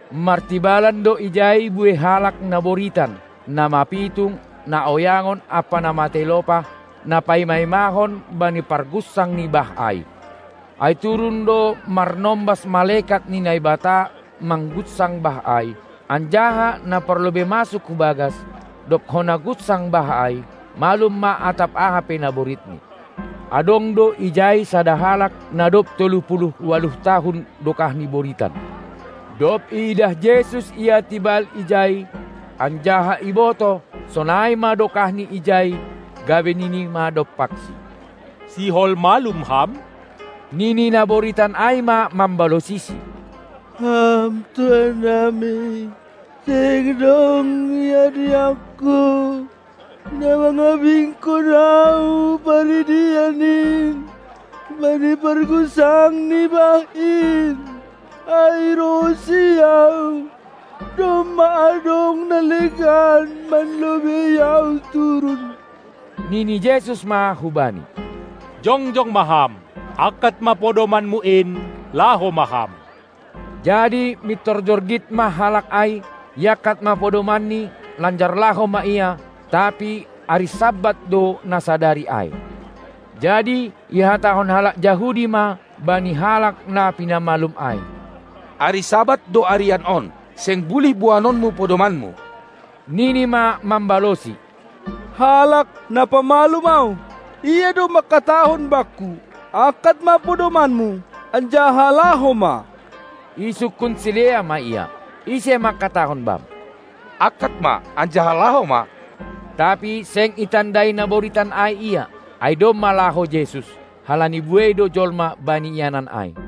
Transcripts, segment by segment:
Martibalan do ijai buei halak na boritan, na mapitung, na oyangon ampa na matei lopah, na paima-imahon bani pargunsang ni bah ai, ai turun do marnombas malekat ni Naibata manggunsang bah ai. Anjaha na parlobei masuk hu bagas, dob hona gunsang bah ai, malum ma atap aha pe naboritni. Adong do ijai sada halak, na dob tolu puluh ualuh tahun dokahni boritan. Dob iidah Jesus ia tibal ijai, anjaha ibotoh, sonai ma dokahni ijai, gabe Nini ma dompaksi: Sihol malum ham? Nini na boritan ai ma mambalosiSi: Ham tuannami, seng dong dihadihangku, na mangabingkon ahu hu paridian in bani pargunsang ni bah in, ai rohhonsi ahu, domma adong na legan manlobei ahu turun. Nini Jesus ma hubani: Jongjong ma ham, angkat ma podomanmu in, laho ma ham! Jadi mintor jorgit ma halak ai, iangkat ma podomanni, lanjar laho ma ia. Tapi ari Sabat do na sadari ai. Jadi ihatahon halak Jahudi ma bani halak na pinamalum ai: Ari Sabat do arian on, seng bulih boanonmu podomanmu! Nini ma mambalosi: Halak, na pamalum ahu, Ia do mangkatahon bakku: Angkat ma podomanmu, anjaha laho ma. Isungkun sidea ma ia: Ise mangkatahon bam: Angkat ma anjaha laho ma? Tapi seng itandai na boritan ai Ia, ai domma laho Jesus, halani buei do jolma bani ianan ai.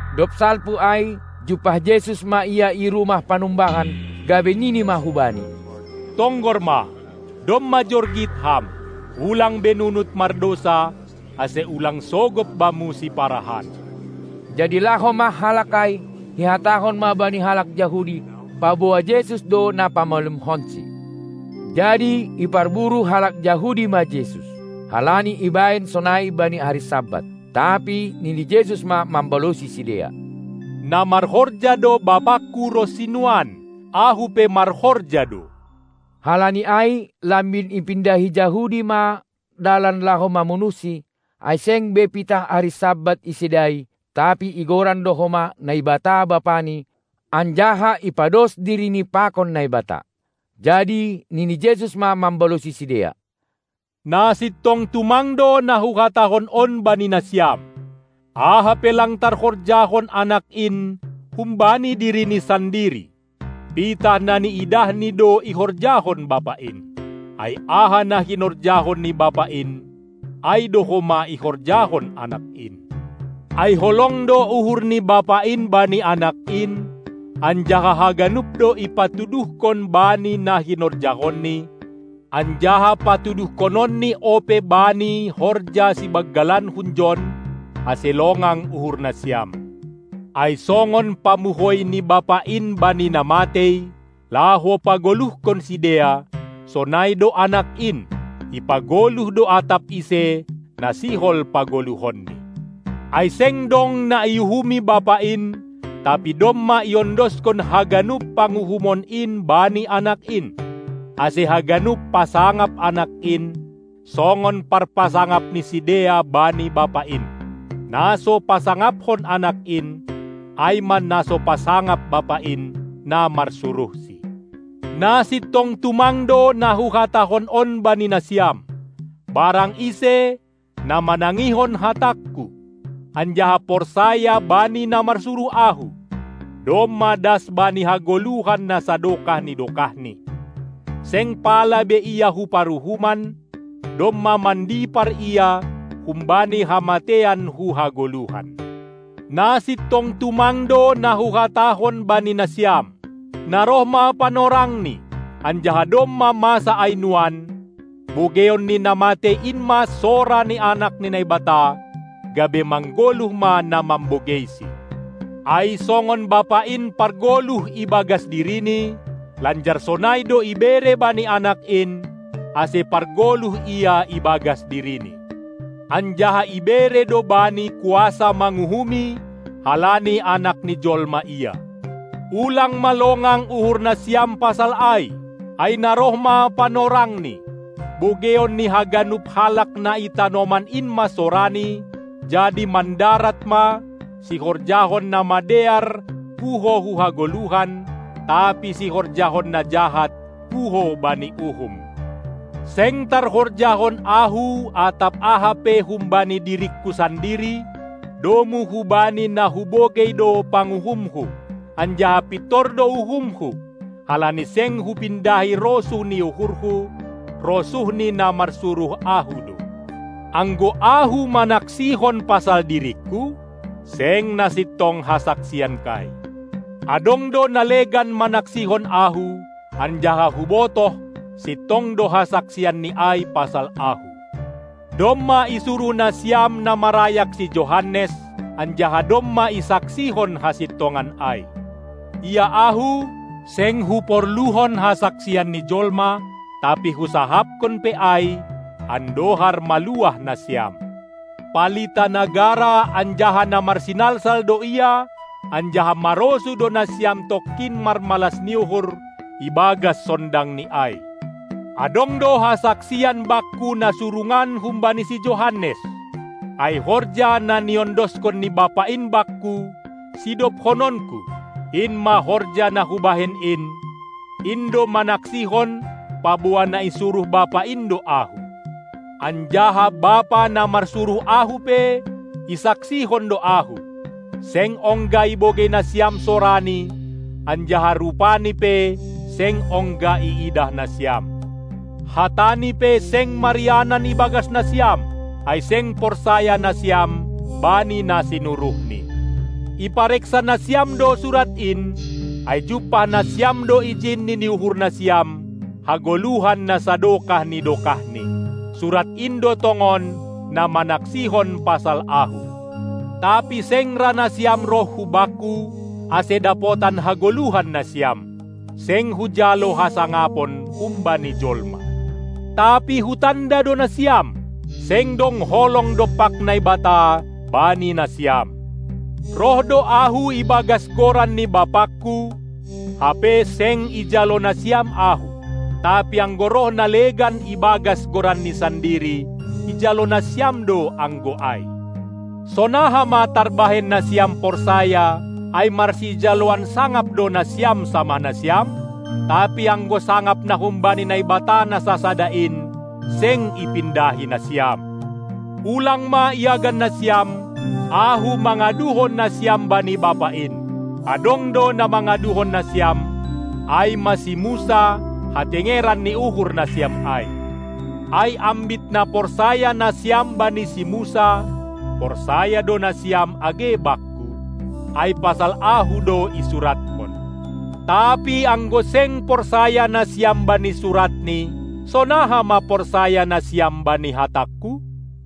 Dob salpu ai, jumpah Jesus ma ia i rumah panumbahan, gabe nini ma hubani: Tonggor ma, domma jorgit ham. Ulang be nunut mardousa, ase ulang sogop bamu siparahan. Jadi laho ma halak ai, ihatahon ma bani halak Jahudi, paboa Jesus do na pamalumkonsi. Jadi iparburu halak Jahudi ma Jesus, halani ibahen sonai bani ari Sabat. Tapi nini Jesus ma mambalosi sidea: Na marhorja do BapaKu ronsi nuan, Ahu pe marhorja do. Halani ai lambin ipindahi Jahudi ma dalan laho mamunuhsi, ai seng be pitah ari Sabat isedai, tapi igoran do homa Naibata Bapani, anjaha ipados diriNi pakon Naibata. Jadi nini Jesus ma mambalosi sidea: Na sintong tumang do na Huhatahon on bani nasiam: Aha pe lang tarhorjahon Anak in humbani diriNi sandiri, pitah na niidahNi do ihorjahon Bapa in. Ai aha na hinorjahon ni Bapa in, ai do homa ihorjahon Anak in. Ai holong do uhur ni Bapa in bani Anak in, anjaha haganup do ipatuduhkon Bani na hinorjahonNi, anjaha patuduhkononNi ope Bani horja sibanggalan hunjon, ase longang uhur nasiam. Ai songon pamuhoi ni Bapa in bani na matei, laho pagoluhkon sidea, sonai do Anak in, ipagoluh do atap ise, na sihol pagoluhonni. Ai seng dong na iuhumi Bapa in, tapi domma iondoskon haganup panguhumon in bani Anak in. Ase haganup pasangap Anak in, songon parpasangap ni sidea bani Bapa in. Na so pasangaphon Anak in, ai ma na so pasangap Bapa in, na marsuruhSi. Na sintong tumang do na Huhatahon on bani nasiam: Barang ise, na manangihon hatangKu anjaha porsaya bani na marsuruh Ahu, domma das bani hagoluhan na sadokah ni dokahni; seng pala be ia hu paruhuman, domma mandipar ia humbani hamateian hu hagoluhan. Na sintong tumang do na Huhatahon bani nasiam: Na roh ma panorangni, anjaha domma masa ai nuan, bogeion ni na matei in ma sora ni Anak ni Naibata, gabe manggoluh ma na mambogeisi. Ai songon Bapa in pargoluh ibagas diriNi, lanjar sonai do ibere bani Anak in, ase pargoluh Ia ibagas diriNi. Anjaha ibere do Bani kuasa manguhumi, halani Anak ni Jolma Ia. Ulang ma longang uhur nasiam pasal ai, ai na roh ma panorangni, bogeion ni haganup halak na i tanoman in ma soraNi, jadi mandarat ma, sihorjahon na madear puho hu hagoluhan, tapi sihorjahon na jahat puho bani uhum. Seng tarhorjahon Ahu atap aha pe humbani diringKu sandiri, domu hubani na Hubogei do panguhumHu, anjaha pintor do uhumHu, halani seng Hupindahi rosuh ni uhurHu, rosuh ni na marsuruh Ahu do. Anggo Ahu manaksihon pasal diringKu, seng na sintong hasaksianKai. Adong do na legan manaksihon Ahu, anjaha Hubotoh sintong do hasaksianni ai pasal Ahu. Domma isuruh nasiam na marayak si Johannes, anjaha domma isaksihon hasintongan ai. Ia Ahu, seng Huporluhon hasaksian ni jolma, tapi Husahapkon pe ai, andohar maluah nasiam. Palita na gara anjaha na marsinalsal do ia, anjaha marosuh do nasiam tongkin marmalas ni uhur ibagas sondangNi ai. Adong do hasaksian Bakku na surungan humbani si Johannes; ai horja, na niondoskon ni Bapa in Bakku, sidobhononKu, in ma horja na Hubahen in, in do manaksihon paboa na isuruh Bapa in do Ahu. Anjaha Bapa na marsuruh Ahu pe isaksihon do Ahu. Seng ongga ibogei nasiam soraNi, anjaha rupaNi pe seng ongga iidah nasiam. Hatani pe seng marianan ibagas nasiam, ai seng porsaya nasiam bani na sinuruhNi. Ipareksa nasiam do Surat in, ai jumpah nasiam do ijin, nini uhur nasiam, hagoluhan na sadokah ni dokahni. Surat in do tongon na manaksihon pasal Ahu. Tapi seng ra nasiam roh hu Bakku, ase dapotan hagoluhan nasiam. Seng Hujalo hasangapon humbani jolma. Tapi Hutanda do nasiam, seng dong holong dompak Naibata bani nasiam. Roh do Ahu ibagas goran ni BapaKu, hape seng ijalo nasiam Ahu. Tapi anggo roh na legan ibagas goranni sandiri, ijalo nasiam do anggo ai. Sonaha ma tarbahen nasiam porsaya, ai marsijaloan sangap do nasiam samah nasiam; tapi anggo sangap na humbani Naibata na sasada in, seng ipindahi nasiam. Ulang ma iagan nasiam, Ahu mangaduhon nasiam bani Bapa in. Adong do na mangaduhon nasiam, ai ma si Musa, hatengeran ni uhur nasiam ai. Ai ambit na porsaya nasiam bani si Musa, porsaya do nasiam age Bakku, ai pasal Ahu do isuratkon. Tapi anggo seng porsaya nasiam bani suratni, sonaha ma porsaya nasiam bani hatangKu?